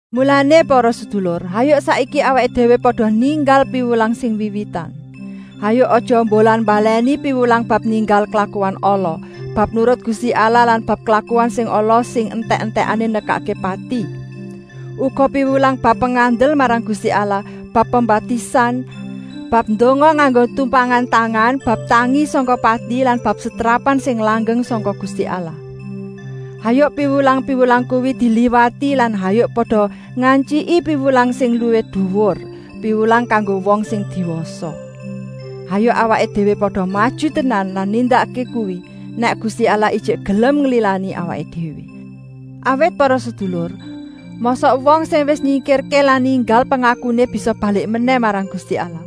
Mulané para sedulur, hayuk saiki awaké déwé pada ninggal piwulang sing wiwitan. Hayuk aja mbolan-mbalèni piwulang bab ninggal klakuan ala, bab nurut Gusti Allah lan bab klakuan sing ala sing entèk-entèké nekakké pati. Uga piwulang bab pengandel marang Gusti Allah, bab pembaptisan, bab ndonga nganggo tumpangan tangan, bab tangi sangka pati lan bab setrapan sing langgeng sangka Gusti Allah. Hayuk piwulang-piwulang kuwi diliwati lan hayuk pada ngantyiki piwulang sing luwih duwur, piwulang kanggo wong sing diwasa. Hayuk awaké déwé pada maju tenan lan nindakké kuwi, nèk Gusti Allah ijik gelem nglilani awaké déwé. Awit para sedulur, mosok wong sing wis nyingkirké lan ninggal pengakuné bisa balik menèh marang Gusti Allah?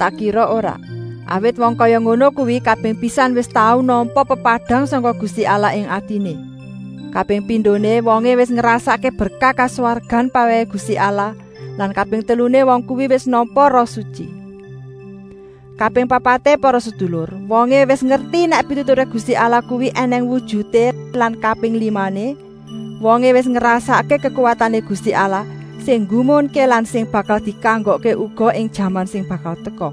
Tak kira ora! Awit wong kaya ngono kuwi kaping pisan wis tau nampa pepadang sangka Gusti Allah ing atiné. Kaping pindoné, wongé wis ngrasakké berkah kaswargan pawèhé Gusti Allah lan kaping teluné wong kuwi wis nampa Roh Sutyi. Kaping papaté para sedulur, wongé wis ngerti nèk pituturé Gusti Allah kuwi ènèng wujuté lan kaping limané, wongé wis ngrasakké kekuwatané Gusti Allah sing nggumunké lan sing bakal dikanggokké uga ing jaman sing bakal teka.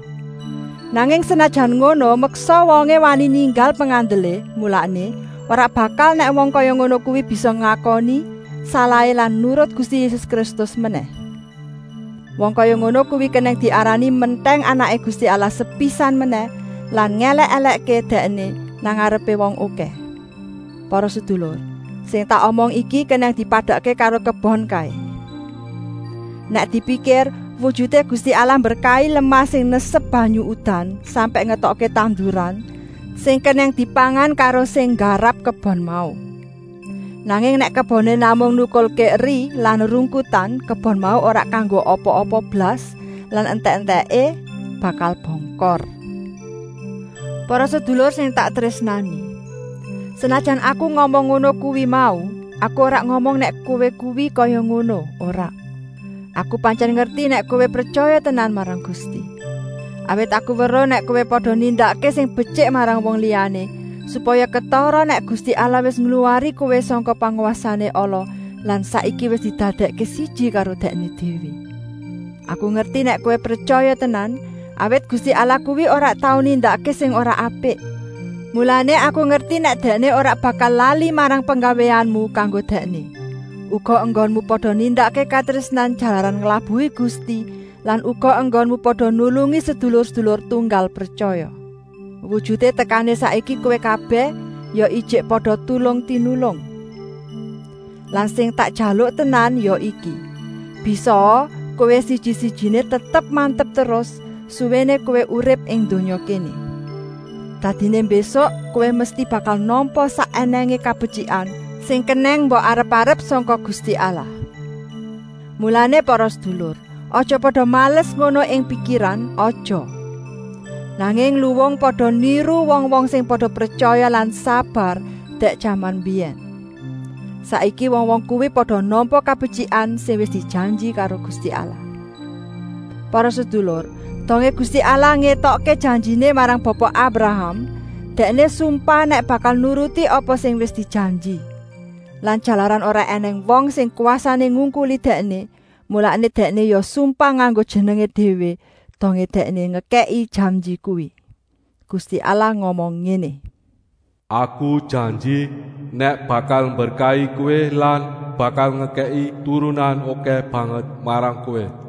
Nanging senajan ngono, meksa wongé wani ninggal pengandelé, mulané, ora bakal nèk wong kaya ngono kuwi bisa ngakoni salahé lan nurut Gusti Yésus Kristus menèh. Wong kaya ngono kuwi kenèng diarani mentèng Anaké Gusti Allah sepisan menèh lan ngèlèk-èlèkké Dèkné nang ngarepé wong okèh. Para sedulur, sing tak omong iki kenèng dipadakké karo kebon kaé. Nèk dipikir, wujuté Gusti Allah mberkahi lemah sing nesep banyu udan, sampèk ngetokké tanduran sing kenèng dipangan karo sing nggarap kebon mau. Nanging nèk keboné namung nukulké eri lan rungkutan, kebon mau ora kanggo apa-apa blas lan entèk-entèké bakal bongkor. Para sedulur sing tak trésnani! Senajan aku ngomong ngono kuwi mau, aku ora ngomong nèk kowé kuwi kaya ngono, ora. Aku pantyèn ngerti nèk kowé pretyaya tenan marang Gusti. Awit aku weruh nèk kowé pada nindakké sing betyik marang wong liyané, supaya ketara nèk Gusti Allah wis ngluwari kowé sangka pangwasané ala lan saiki wis didadèkké siji karo Dèkné déwé. Aku ngerti nèk kowé pretyaya tenan, awit Gusti Allah kuwi ora tau nindakké sing ora apik. Mulané aku ngerti nèk Dèkné ora bakal lali marang penggawéanmu kanggo Dèkné, uga enggonmu pada nindakké katrésnan jalaran nglabuhi Gusti lan uga enggonmu pada nulungi sedulur-sedulur tunggal pretyaya. Wujuté tekané saiki kowé kabèh ya ijik pada tulung-tinulung. Lan sing tak jaluk tenan ya iki, bisaa kowé siji-sijiné tetep-mantep terus suwéné kowé urip ing donya kéné. Dadiné mbésuk kowé mesti bakal nampa sak ènèngé kabetyikan sing kenèng mbok arep-arep sangka Gusti Allah. Mulané para sedulur, aja pada males ngono ing pikiran, aja, nanging luwung pada niru wong-wong sing pada pretyaya lan sabar dèk jaman mbiyèn. Saiki wong-wong kuwi pada nampa kabetyikan sing wis dijanji karo Gusti Allah. Para sedulur, dongé Gusti Allah ngetokké janjiné marang Bapa Abraham, Dèkné sumpah nèk bakal nuruti apa sing wis dijanji. Lan jalaran ora ènèng wong sing kwasané ngungkuli Dèkné, mulané Dèkné ya sumpah nganggo jenengé déwé dongé Dèkné ngekèki janji kuwi. Gusti Allah ngomong ngéné: “Aku janji nèk bakal mberkahi kowé lan bakal ngekèki turunan okèh banget marang kowé.”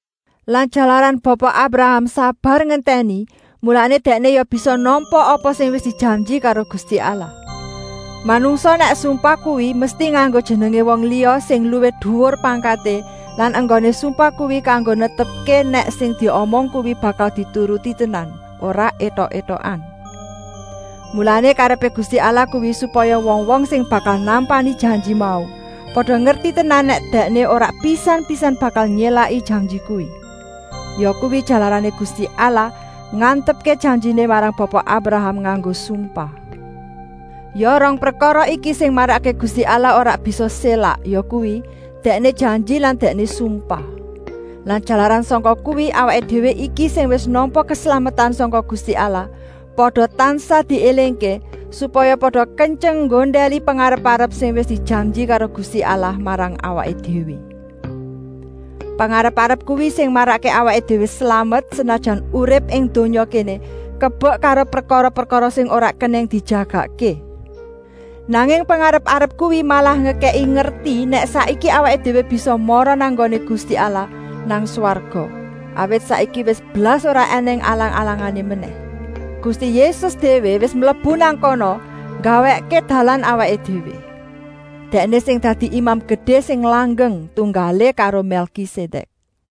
Lan jalaran Bapa Abraham sabar ngentèni, mulané dèkné ya bisa nampa apa sing wis dijanji karo Gusti Allah. Manungsa nèk sumpah kuwi mesti nganggo jenengé wong liya sing luwih duwur pangkaté lan enggoné sumpah kuwi kanggo netepké nèk sing diomong kuwi bakal dituruti tenan, ora étok-étokan. Mulané, karepé Gusti Allah kuwi supaya wong-wong sing bakal nampani janji mau pada ngerti tenan nèk Dèkné ora pisan-pisan bakal nyélaki janji kuwi. Yakuwi jalarané Gusti Allah ngantepké janjiné marang Bapa Abraham nganggo sumpah. Ya rong prekara iki sing marakké Gusti Allah ora bisa sélak, yakuwi, Dèkné janji lan Dèkné sumpah. Lan jalaran sangka kuwi, awaké déwé iki sing wis nampa keslametan sangka Gusti Allah, pada tansah diélingké, supaya pada kentyeng nggondèli pengarep-arep sing wis dijanji karo Gusti Allah marang awaké déwé. Pengarep-arep kuwi sing marakké awaké déwé slamet, senajan urip ing donya kéné kebek karo prekara-prekara sing ora kenèng dijagakké. Nanging pengarep-arep kuwi malah ngekèki ngerti, nèk saiki awaké déwé bisa mara nang nggoné Gusti Allah nang swarga, awit saiki wis blas ora ènèng alang-alangané menèh. Gusti Yésus déwé wis mlebu nang kana nggawèkké dalan awaké déwé. Dèkné sing dadi Imam Gedé sing langgeng, tunggalé karo Mèlkisedèk.